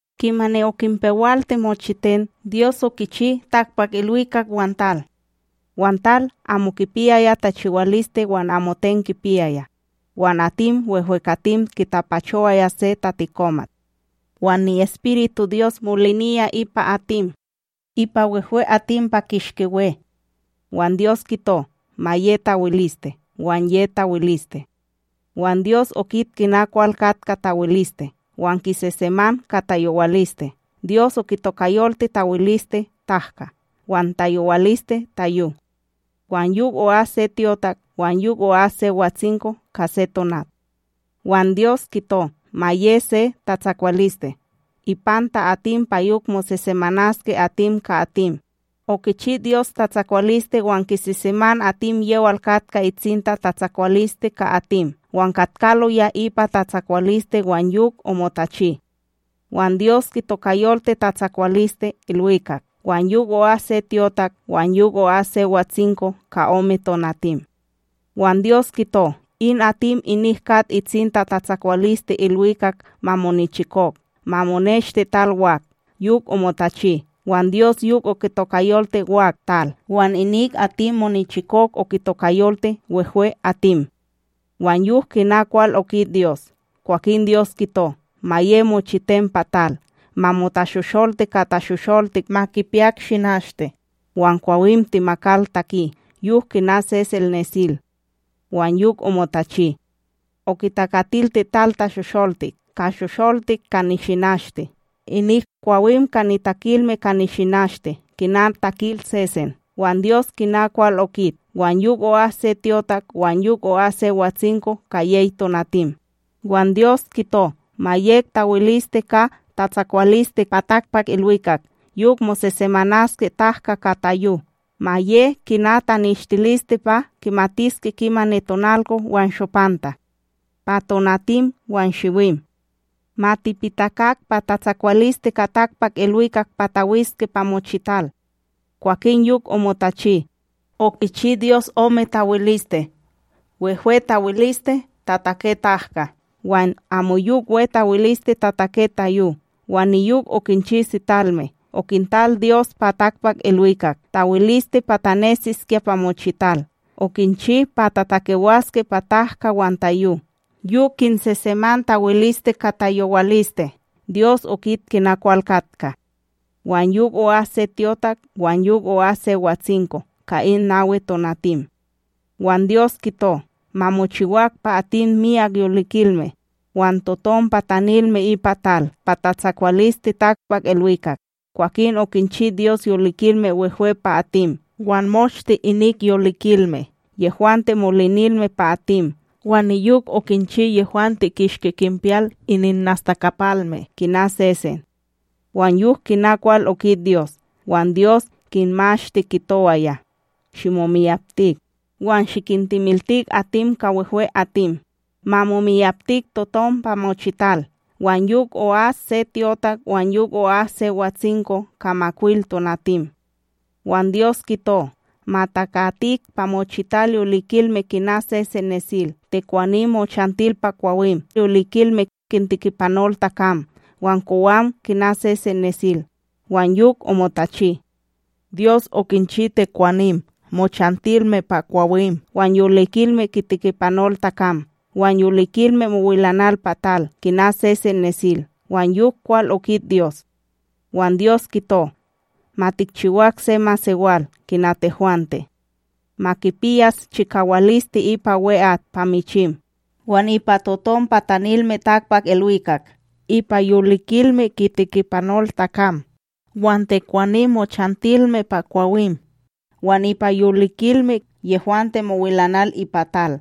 Kimani okinpewalti mochiten, Dyos, okichi takpakIlwikak wan tal. Wan tal amo kipiyaya tachiwaliste wan amoten kipiyaya, wan atim wehwekatim kitapachowaya se tatikomat, wan ni'EspirituDyos moliniya ipa atim, ipa wehwe'atim pa kishki we. Wan Dyos kito: “Ma ye tawiliste!” Wan ye tawiliste. Wan Dyos okit kina kwal katka tawiliste wan kiseseman ka tayowaliste. Dyos okitokayolti tawiliste “tahka”, wan tayowaliste, “tayo”. Wan yok o'as se tyotak, wan yok o'as se watsinko: ka se tonat. Wan Dyos kito: “Ma ye se tatsakwaliste ipanta atim, pa yok mosesemanaske atim ka atim!” Okichi Dyos tatsakwaliste wan kiseseman atim yewal katka itsinta, tatsakwaliste ka atim wan katkaloya ipa tatsakwaliste wan yok omotachi. Wan Dyos kitokayolti tatsakwaliste “ilwikak”. Wan yok o'as se tyotak, wan yok o'as se watsinko: ka ome tonatim. Wan Dyos kito: “In atim inik kat itsinta tatsakwaliste ilwikak ma monichikok, ma moneshte tal wak!” Yok omotachi. Wan Dyos yok okitokayolti wak “tal”, wan inik atim monichikok okitokayolti “wehwe'atim”. Wan yok kina kwal okit Dyos. Kwakin Dyos kito: “Ma ye mochiten pa tal; ma motashosholti ka tashosholtik ma kipiyak nishinashte, wan kwawim temakal taki, yok kina sesen nesil!” Wan yok omotachi. Okitakatilti tal tashosholtik: ka shosholtik ka nishinashte, inik kwawim ka nitakilme ka nishinashte, kina takil sesen. Wan Dyos kina kwal okit. Wan yok o'as se tyotak, wan yok o'as se watsinko: ka yey tonatim. Wan Dyos kito: “Ma yek tawiliste ka tatsakwaliste pa takpakIlwikak yok mosesemanaske tahka ka tayo; ma ye kina taneshtiliste pa kimatiske kimani tonalko wan shopanta, pa tonatim wan shiwim, ma tipitakak pa tatsakwaliste ka takpakIlwikak pa tawiske pa mochital!” Kwakin yok omotachi. Okichi Dyos ome tawiliste: wehwe tawiliste tatake tahka, wan amoyok we tawiliste tatake tayo. Wan niyok okinchi sitalme. Okintal Dyos pa takpakIlwikak tawiliste pa tanesiskya pa mochital. Okinchi pa tatakewaske pa tahka wan tayo, yok kinseseman tawiliste ka tayowaliste. Dyos okit kina kwal katka. Wan yok o'as se tyotak, wan yok o'as se watsinko: ka in nawi tonatim. Wan Dyos kito: “Ma mochiwak pa atim myak yolikilme, wan totom patanilme ipa tal pa tatsakwaliste takpakIlwikak!” Kwakin okinchi Dyos yolikilme wehwe pa atim, wan moshte inik yolikilme yehwante molinilme pa atim wan niyok okinchi yehwante kishki kinpiyal ininnastakapalme, kina sesen. Wan yok kina kwal okit Dyos, wan Dyos kinmashti kitowaya: “Shimomiyaptik; wan shikintemiltik atim ka wehwe'atim. Ma momiyaptik totom pa mochital!” Wan yok o'as se tyotak, wan yok o'as se watsinko: ka makwil tonatim. Wan Dyos kito: “Ma takatik pa mochital yolikilme kina sesen nesil: tekwanim mochantil pa kwawim, yolikilme kintikipanol takam, wan kowam, kina sesen nesil!” Wan yok omotachi. Dyos okinchi tekwanim mochantilme pa kwawim, wan yolikilme kitikipanol takam, wan yolikilme mowilanal pa tal, kina sesen nesil. Wan yok kwal okit Dyos, wan Dyos kito: “Ma tikchiwak se masewal kina tehwante. Ma kipiyas chikawaliste ipa we'at pa michim, wan ipa totom patanilme takpakIlwikak; ipa yolikilme kitikipanol takam, wan tekwanim mochantilme pa kwawim, wan ipa yolikilme yehwante mowilanal ipa tal.”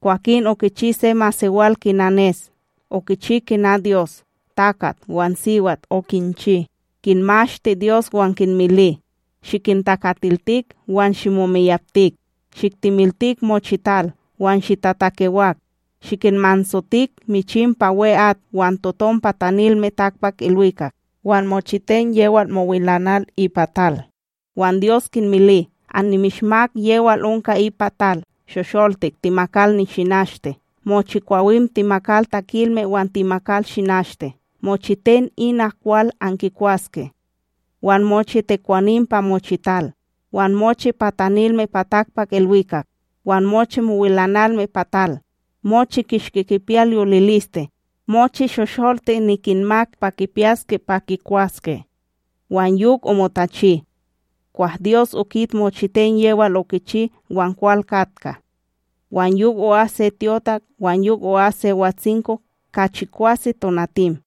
Kwakin okichi se masewal kina nes; okichi kina Dyos. Takat wan siwat okinchi, kinmashti Dyos wan kinmili: “Shikintakatiltik wan shimomiyaptik; shiktemiltik mochital wan shitatakewak; shikinmansotik michim pa we'at wan totom patanilme takpakIlwikak, wan mochiten yewal mowilanal ipa tal.” Wan Dyos kinmili: “Annimishmak yewal onka ipa tal shosholtik temakal nishinashte mochi kwawim temakal takilme wan temakal shinashte; mochiten ina kwal ankikwaske. Wan mochi tekwanim pa mochital, wan mochi patanilme pa takpakIlwikak, wan mochi mowilanalme pa tal, mochi kishki kipiyal yoliliste, mochi shosholtik nikinmak pa kipiyaske pa kikwaske.” Wan yok omotachi. Kwah Dyos okit mochiten yewal okichi, wan kwal katka. Wan yok o'as se tyotak, wan yok o'as se watsinko: ka chikwase tonatim.